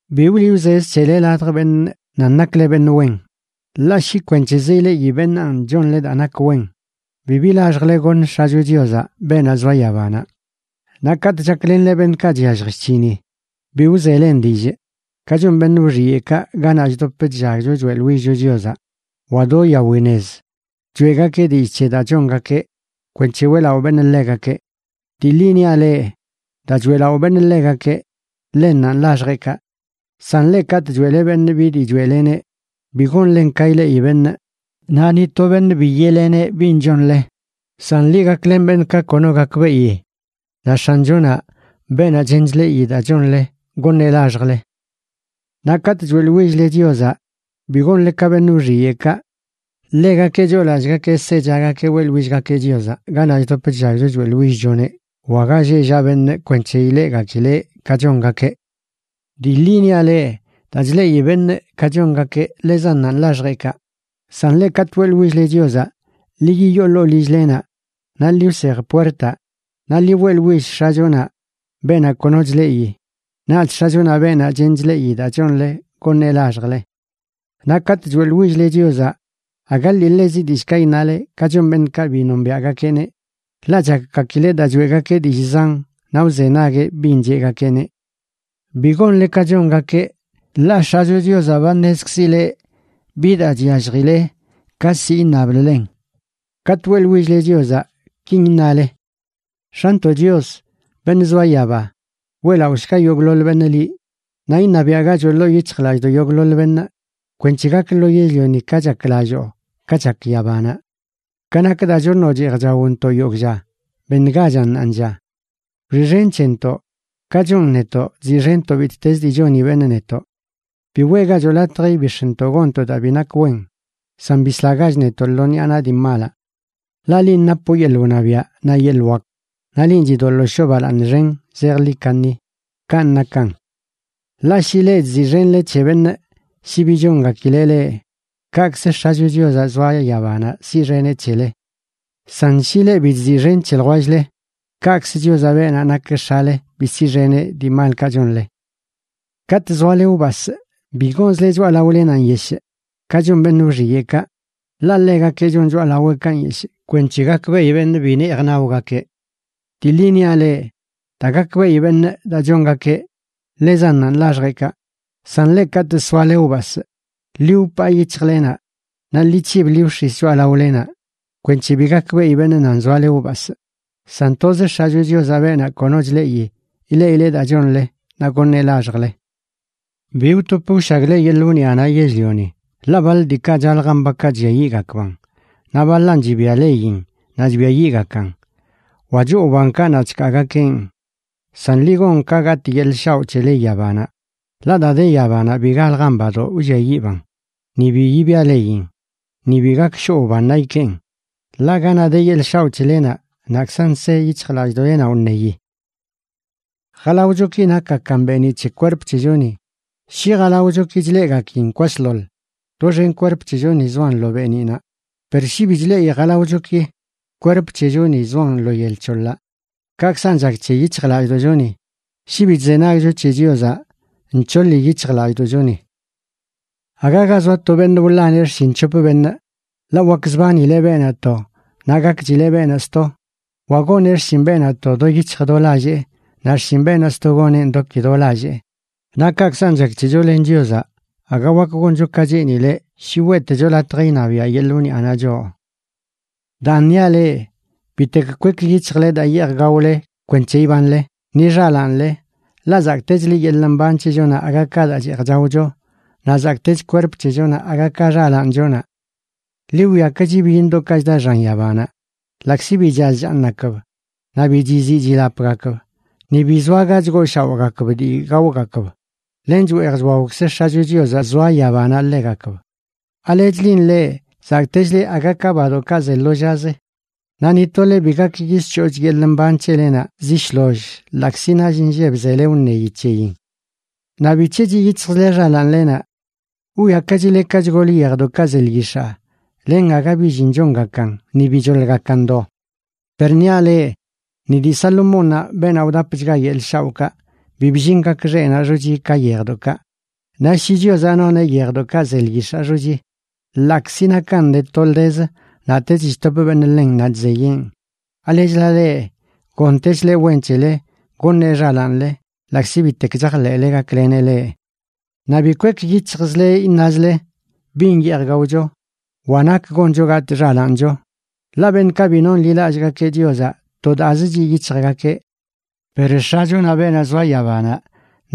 ’Bi wliꞌ wzez c̱hele ladj beṉꞌ nan nakle beṉꞌ wen. Ḻaꞌ shi kwenc̱hezə ileꞌi beṉaan chonle daa nak wen, bibi laxjle goṉ X̱acho Chiozaꞌ, beenaꞌ zoa yabanaꞌ. Naꞌ katꞌ chaklenle beṉꞌkaꞌ chyallj chc̱hini, bi wzelen dillꞌ, ka chon beṉꞌ wxiyeꞌkaꞌ ganaꞌ chdop chllagcho choeꞌḻwillcho Chiozaꞌ, wa do yawi nez. Choeꞌgakeꞌ dillꞌ c̱he daa chongakeꞌ kwenc̱he weꞌlaꞌo beṉꞌ ḻegakeꞌ. Dii ḻi niaꞌ leꞌ, daa choeꞌlaꞌo beṉꞌ ḻegakeꞌ, ḻennanꞌ laxjeꞌkaꞌ. San leꞌ, katꞌ choeꞌle beṉꞌ bi dii choeꞌleneꞌ, bi gonlen ka ileꞌi beṉꞌ. Naꞌ ni to beṉꞌ bi yeꞌleneꞌ bin chonle. San ḻi gaklen beṉꞌ ka kono gakbeꞌi. Naꞌ X̱achonaꞌ, beenaꞌ chen chleꞌi daa chonle, goṉeꞌ laxjle. ’Naꞌ katꞌ choeꞌḻwill-le Chiozaꞌ, bi gonle ka beṉꞌ wxiyeꞌkaꞌ. Ḻegakeꞌ choolallꞌgakeꞌ sechagakeꞌ weꞌḻwillgakeꞌ Chiozaꞌ ganaꞌ chdop chllagcho choeꞌḻwillchoneꞌ wa ga lleꞌ llaꞌ beṉꞌ kwenc̱he ileꞌgakileꞌ ka chongakeꞌ. Dii ḻi niaꞌ leꞌ, daa chleꞌi beṉꞌ ka chongakeꞌ, ḻezannanꞌ laxjeꞌkaꞌ. San leꞌ, katꞌ weꞌḻwill-le Chiozaꞌ, ḻi yiyoo ḻoo lill-lenaꞌ naꞌ ḻi wsej puertaꞌ, naꞌ ḻi weꞌḻwill X̱achonaꞌ, beenaꞌ kono chleꞌi. Naꞌch X̱achonaꞌ, beenaꞌ chen chleꞌi daa chonle, goṉeꞌ laxjle. ’Naꞌ katꞌ choeꞌḻwill-le Chiozaꞌ aga ḻiḻezi dillꞌkaꞌ iṉale ka chon beṉꞌkaꞌ bi nombiaꞌgakeꞌneꞌ, ḻaꞌ chakgakileꞌ daa choeꞌgakeꞌ dillꞌ zan naꞌ wzenagueꞌ bin cheꞌgakeꞌneꞌ. Bi gonle ka chongakeꞌ, ḻaꞌ X̱acho Chiozaꞌ ba ṉezkzileꞌ bi daa chyalljile ka ziꞌ iṉabləlen. Katꞌ weꞌḻwill-le Chiozaꞌ, kin iṉale: X̱antoꞌ Chios, beṉꞌ zoa yaba, weꞌlaꞌoshga yogꞌḻoḻ beṉꞌ liꞌ. Naꞌ iṉabiaꞌgachoꞌ ḻoo yic̱hjlallꞌdoꞌ yogꞌḻoḻ beṉꞌ, kwenc̱he gak lo yell-lioni ka chaklalloo, ka chak yabanaꞌ. Ka nak daa choṉoꞌ cheej chaontoꞌ yogꞌ lla, beṉgachan ṉaanlla. Wxiꞌxen c̱hentoꞌ, ka chon netoꞌ chziꞌxenntoꞌ bittezə dii choni beṉꞌ netoꞌ. Bi weꞌgachoꞌ latj ibix̱ntoꞌ gonntoꞌ daa bi nak wen, san bislagach netoꞌ lo ṉiꞌa naꞌ dii malaꞌ. Ḻaꞌ linꞌ napoꞌ yeḻꞌ wṉabiaꞌ, naꞌ yeḻꞌ wak, naꞌ linꞌ chidoḻoo shoo balaaṉ xen zejḻi kaṉi. Kanꞌ nakan. ’Ḻaꞌ shi leꞌ chziꞌxenle c̱he beṉꞌ shi bi chongakileꞌ leꞌ, kaꞌkzə X̱acho Chiozaꞌ zoa yabanaꞌ siꞌxeneꞌ c̱hele. San shi leꞌ bi chziꞌxen c̱he ljwell-le, kaꞌkzə Chiozaꞌ, beenaꞌ nak X̱ale, bi siꞌxeneꞌ dii malkaꞌ chonle. ’Katꞌ zoale wbasꞌ, bi gonzle choꞌalaolenaꞌ nyeshꞌ ka chon beṉꞌ wxiyeꞌkaꞌ, ḻaꞌ ḻegakeꞌ chon choꞌalaweꞌkaꞌ nyeshꞌ kwenc̱he gakbeꞌi beṉꞌ bi neej naogakeꞌ. Dii ḻi niaꞌ leꞌ, daa gakbeꞌi beṉꞌ daa chongakeꞌ, ḻezannanꞌ laxjeꞌkaꞌ. San leꞌ, katꞌ soale wbasꞌ, ḻi wpaa yic̱hjlenaꞌ naꞌ ḻi c̱hib ḻi wx̱is choꞌalaolenaꞌ kwenc̱he bi gakbeꞌi beṉꞌ nan zoale wbasꞌ. San toz X̱acho Chiozaꞌ, beenaꞌ kono chleꞌi, ileꞌileꞌ daa chonle naꞌ goṉeꞌ laxjle. ’Bi wtop wshagle yeḻꞌ wniꞌanaꞌ yell-lioni, ḻaꞌ baḻ diikaꞌ chaljan bakaꞌ chlliayiꞌgakban, naꞌ baḻan chibia leyin naꞌ chbiayiꞌgakan, wa choo wbankaꞌ naꞌ chkaagakeꞌn. San ḻi gon ka gatꞌ yeḻꞌ shaoꞌ c̱hele yabanaꞌ, ḻaꞌ daa de yabanaꞌ bi galjan badoꞌ wlliayiꞌban, ni bi yibia leyin, ni bi gak shoꞌ wbannaꞌ ikeen. Ḻaꞌ ganaꞌ de yeḻꞌ shaoꞌ c̱helenaꞌ, naꞌkzan se yic̱hjlallꞌdoꞌlenaꞌ wṉeyi. ’Jalaochoki nakgakan beeniꞌ c̱he kwerp c̱hechoni. Shi jalaochoki chleꞌgakin kwasḻoḻ, doxen kwerp c̱hechoni zoan lo beeniꞌnaꞌ. Per shi bi chleꞌi jalaochoki, kwerp c̱hechoni zoan lo yel c̱hoḻaꞌ. Kaꞌkzan chak c̱he yic̱hjlallꞌdoꞌchoni. Shi bi chzenagcho c̱he Chiozaꞌ, nc̱hoḻi yic̱hjlallꞌdoꞌchoni. ’Aga ga zoa to beṉꞌ wḻaneꞌ xshin c̱hop beṉꞌ, ḻaꞌ wakzbanileꞌ beenaꞌ to, naꞌ gakchileꞌ beenaꞌ sto, wa goneꞌ xshin beenaꞌ to do yic̱hj do lallee naꞌ xshin beenaꞌ sto goneꞌn do ki do lallee. Naꞌ kaꞌkzan chak c̱hecho len Chiozaꞌ, aga wak goncho ka cheenileꞌ shi weꞌtecho latj iṉabiaꞌ yeḻꞌ wniꞌanaꞌ choꞌ. ’Daan niaꞌ leꞌ: Bitek kwek yic̱hjle daa yeej gaole kwenc̱he ibanle, ni xalaanle. Ḻaꞌ zakꞌtechlə yeḻꞌ mban c̱hechonaꞌ aga ka daa cheej chaocho, naꞌ zakꞌtech kwerp c̱hechonaꞌ aga ka xalaanchonaꞌ. Ḻi wwiakachi byiṉdoꞌkaꞌ chda xan yabanaꞌ, ḻaꞌkzi bi chaz chaaṉgakb naꞌ bibi chiziꞌ chilapgakb, ni bi zoa ga chgooshaoꞌgakb dii gaogakb, len chweej chwaokz X̱acho Chiozaꞌ zoa yabanaꞌ ḻegakb. ¿Alechlin leꞌ, zakꞌtechle aga ka badoꞌkaꞌ ze lo llazə? Naꞌ ni tole bi gak yisc̱hooch yeḻꞌ mban c̱helenaꞌ zi shloll ḻaꞌkzi nall inlleb zele wṉeyi c̱heyin. ’Naꞌ ¿bic̱he chiꞌ yic̱hjzle xalaanlenaꞌ? Wwiakachile ka chgol yejdoꞌkaꞌ ze lyix̱aa, len aga bi llin chongakan ni bi choḻgakan do. Per niaꞌ leꞌ, ni dii Salomónnaꞌ, beenaꞌ wdapchga yeḻꞌ shaoꞌkaꞌ, bi bllin gak xeꞌnaꞌ xochi ka yejdoꞌkaꞌ. Naꞌ shi Chiozaꞌ noneꞌ yejdoꞌkaꞌ ze lyix̱aa xochi, ḻaꞌkzi nakan de toldezə naꞌtech chtop beṉꞌ ḻen naꞌ chzeyeꞌn, ¿alechla leꞌ, gontechleꞌ wen c̱hele goṉeꞌ xalaanle ḻaꞌkzi bitek chajḻeꞌle gakleneꞌ leꞌ? Naꞌ bi kwek yic̱hjzle iṉazle: “¿Bin yeej gaocho?” wa “¿Nak goncho gatꞌ xalaancho?” Ḻaꞌ beṉꞌkaꞌ bi nonḻilallꞌgakeꞌ Chiozaꞌ to daazə chiꞌ yic̱hjgakeꞌ. Per X̱achonaꞌ, beenaꞌ zoa yabanaꞌ,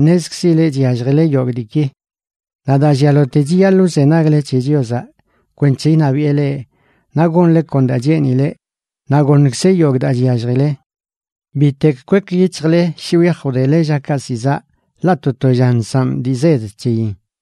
ṉezkzileꞌ chyalljile yogꞌ diiki. Naꞌ daa llialote chiyaḻꞌ wzenagle c̱he Chiozaꞌ kwenc̱he iṉabiꞌe leꞌ, naꞌ gonle kon daa cheenileꞌ, naꞌ goṉkzeꞌ yogꞌ daa chyalljile. Bitek kwek yic̱hjle shi wyaj wdele llakaꞌ zi zaꞌ ḻaꞌ to to lla nsaꞌ dii zed c̱heyin.